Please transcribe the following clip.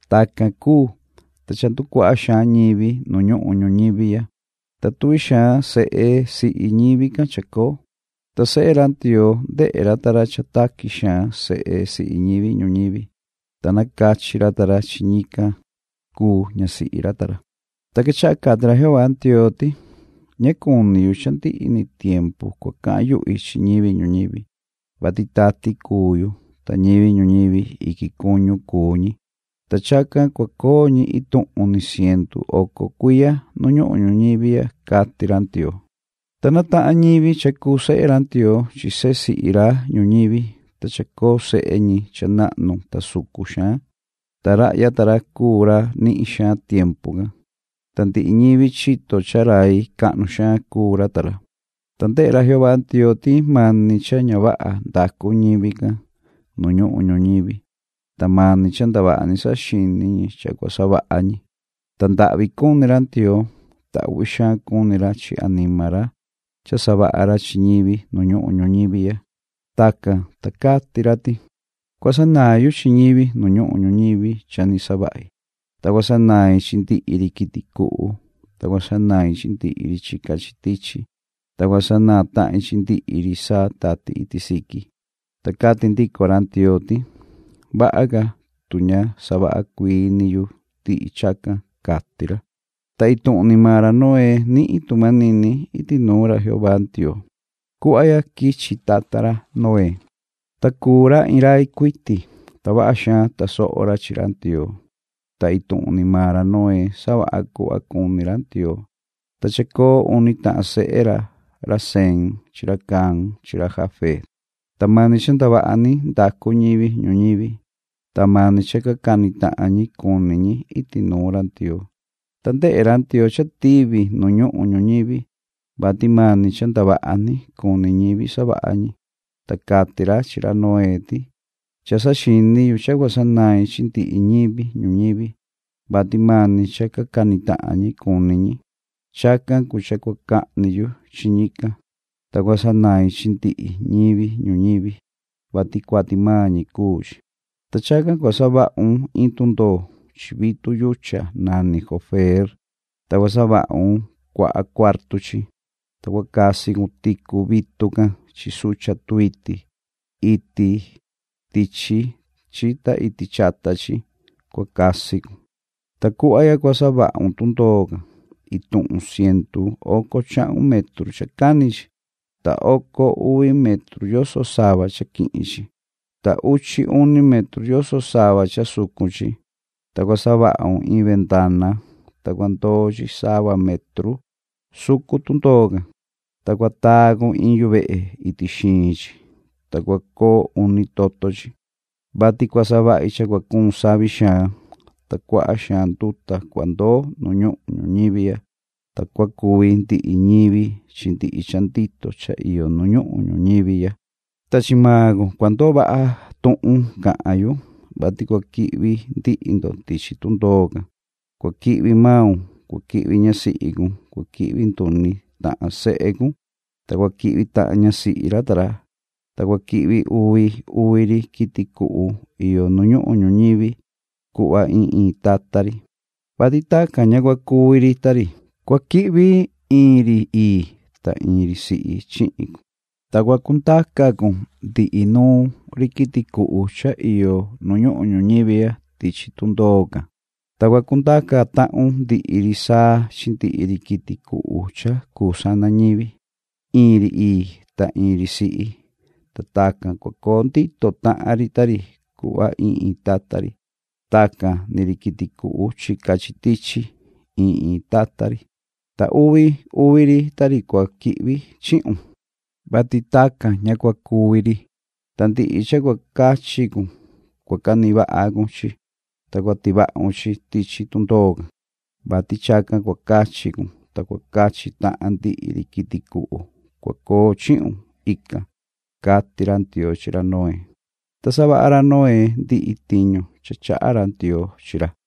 Tacan cuu, ta cha nducuaha xaan ñivi nu ñuhun ñuñivi ya, ta tuvi xaan sehe sihi ñivi can chacoo, ta sehe ra Ndioo ndehe ra ta ra cha taqui xaan sehe sihi ñivi ñuñivi, ta nacachi ra ta ra chi ñican cuu ñasihi ra ta ra. Ta quechaha cati ra Jehová Ndioo ti: “Ña cuni yu cha ndihi ni tiempu cua cahan yuhi chi ñivi ñuñivi, vati tati cuu yu, ta ñivi ñuñivi iquin cuñu cuu ñi, ta chacan cua coo ñi ituhun ni cientu oco cuiya nu ñuhun ñuñivi ya”, cati ra Ndioo. Ta natahan ñivi cha cuu sehe ra Ndioo chi sehe sihi ra ñuñivi, ta chacoo sehe ñi cha nahnu ta sucun xaan. Ta rahya ta ra cuu ra nihin xaan tiempu can, ta ndihi ñivi chito cha rai cahnu xaan cuu ra ta ra. Ta ndehe ra Jehová Ndioo ti mani cha ña vaha ndacu ñivi can nu ñuhun ñuñivi, ta mani cha ndavaha ni saxini ñi cha cua savaha ñi. Ta ndahvi cuni ra Ndioo, ta uhvi xaan cuni ra chi anima ra cha savaha ra chi ñivi nu ñuhun ñuñivi ya. Tacan, ta cati ra ti: “Cua sanaan yu chi ñivi nu ñuhun ñuñivi cha ni savahi, ta cua sanain chi ndihi ri quiti cuhu, ta cua sanain chi ndihi ri chica chi tichi, ta cua sanaan tahin chi ndihi ri saa tati iti siqui”, ta cati ndico ra Ndioo ti: “Vaha ca, tu ña savaha cuii ni yu ndihi chacan”, cati ra. Ta ituhun ni maan ra Noé nihin tu manini iti nuun ra Jehová Ndioo. Cuhva ya quichi tata ra Noé. Ta cuu ra iin rai cuiti, ta vaha xaan tasoho ra chi ra Ndioo, ta ituhun ni maan ra Noé savaha cuhva cuni ra Ndioo. Ta chacoo uni tahan sehe ra, ra Sem chi ra Cam chi ra Jafet. Ta mani cha ndavaha ni ndacu ñivi ñuñivi, ta mani cha ca cani tahan ñi cuni ñi iti nuun ra Ndioo. Ta ndehe ra Ndioo cha tivi nu ñuhun ñuñivi, vati mani cha ndavaha ni cuni ñivi savaha ñi. Ta cati ra chi ra Noé ti: “Cha saxini yu cha cua sanain chi ndihi ñivi ñuñivi, vati mani cha ca cani tahan ñi cuni ñi. Chacan cuu cha cua cahni yu chi ñican, ta cua sanain chi ndihi ñivi ñuñivi, vati cuati maan ñi cuu chi. Ta chacan cua savahun iin tundoo. Chi vitu yuchan nani gofer, ta cua savahun cuaha cuartu chi, ta cua casi cun ticu vitu can chi sucha tuiti. Iti tichi chi ta iti chata chi cua casi cun. Ta cuhva ya cua savahun tundoo can. Ituhun cientu oco chahun metru cha cani chi, ta oco uvi metru yoso sava cha quihin chi, ta uchi uni metru yoso sava cha sucun chi. Ta cua savahun iin vendana, ta cua ndoo chi sava metru sucun tundoo can, ta cua taa cun iin yuvehe iti xiin chi, ta cua coo uni toto chi, vati cua savahi cha cua cuun savi xaan, ta cuaha xaan nduta cua ndoo nu ñuhun ñuñivi ya, ta cua cuvi ndihi ñivi chi ndihi cha ndito cha iyo nu ñuhun ñuñivi ya. Ta chi maan cun cua ndoo vaha tuhun cahan yu, vati cua quihvi ndihi ndo tichi tundoo can. Cua quihvi maun, cua quihvi ñasihi cun, cua quihvi nduni tahan sehe cun, ta cua quihvi tahan ñasihi ra ta ra. Ta cua quihvi uvi uvi ri quiti cuhu iyo nu ñuhun ñuñivi cuhva iin iin tata ri, vati tacan ña cua cuvi ri ta ri. Cua quihvi iin ri ii, ta iin ri sihi chihin cun. Ta cua cundaca cun ndihi nuun ri quiti cuhu cha iyo nu ñuhun ñuñivi ya tichi tundoo can, ta cua cundaca tahun ndihi ri saa chi ndihi ri quiti cuhu cha cuu sana ñivi, iin ri ii ta iin ri sihi, ta tacan cua coo ndito tahan ri ta ri cuhva iin iin tata ri. Tacan ni ri quiti cuhu chica chi tichi iin iin tata ri, ta uvi uvi ri ta ri cua quihvi chihun, vati tacan ña cua cuvi ri. Ta ndihi cha cuu cachi cun cua canihin vaha cun chi, ta cua tivahun chi tichi tundoo can, vati chacan cua cachi cun ta cua cachi tahan ndihi ri quiti cuhu cua coo chihun ican”, cati ra Ndioo chi ra Noé. Ta savaha ra Noé ndihi tiñu cha chaha ra Ndioo chi ra.